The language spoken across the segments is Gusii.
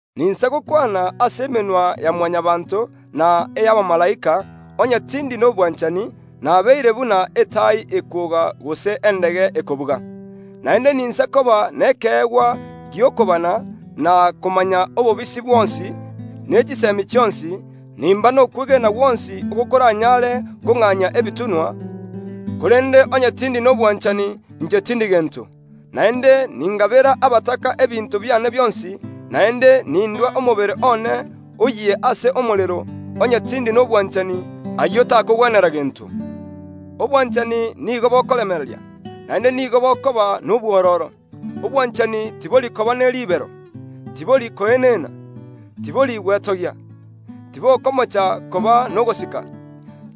Ninsa gokwana ase emenwa ya Mwanyabaanto na ey’abamalaika, onye tindi nobwanchani, nabeire buna etai ekwoga gose endege ekobuga. Naende ninsa koba nekeegwa gi’okobana, na komanya obobisi bwonsi, ne chisemi chionsi; nimba nokwegena gwonsi oko koranyare kong’anyia ebitunwa, korende onye tindi nobwanchani, inche tindi gento. Naende ningabera abataka ebinto biane bionsi, naende nindua omobere one oyie ase omorero, onye tindi nobwanchani, ayio takongwenera gento. Obwanchani nigo bokoremereria, naende nigo bokoba nobwororo. Obwanchani tibori koba ne ribero, tibori koenena, tibori gwetogia, tibokomocha koba nogosika,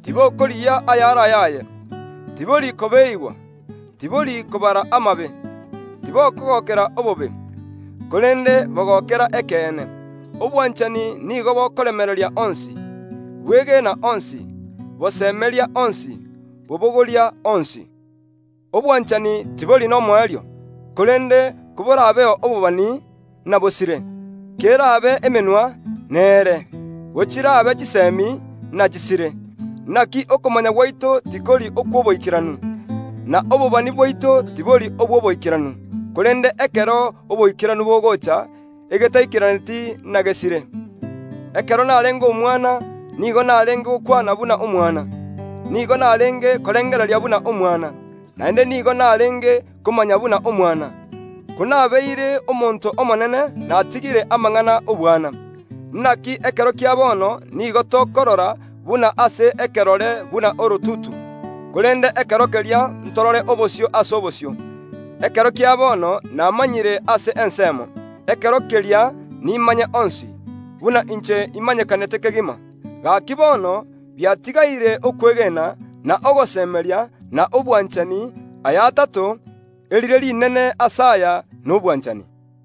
tibokorigia ayare ayaye, tibori kobeeigwa, tibori kobara amabe; tibokogokera obobe, korende bogokera ekeene. Obwanchani nigo bokoremereria onsi, bwegeena onsi, bosemeria onsi, bobogoria onsi. Obwanchani tibori nomoerio; korende koborabeo obobani, nabosire; kerabe emenwa, neere; gochirabe chisemi, nachisire. Naki okomanya gwaito tikori okw’oboikeranu, na obobani bwaito tibori obw’oboikeranu; korende ekero oboikeranu bogocha, egetaikeraneti nagesire. Ekero narenge omwana, nigo narenge gokwana buna omwana, nigo narenge korengereria buna omwana, naende nigo narenge komanya buna omwana; konabeire omonto omonene natigire amang’ana y’obwana. Naki ekero kia bono nigo tokorora buna ase ekerore buna orotutu; korende ekero keria ntorore obosio ase obosio. Ekero kia bono namanyire ase ensemo; ekero keria nimanye onsi, buna inche imanyekanete kegima. Gaki bono biatigaire okwegena, na ogosemeria, na obwanchani, aya atato; erire rinene ase aya nobwanchani.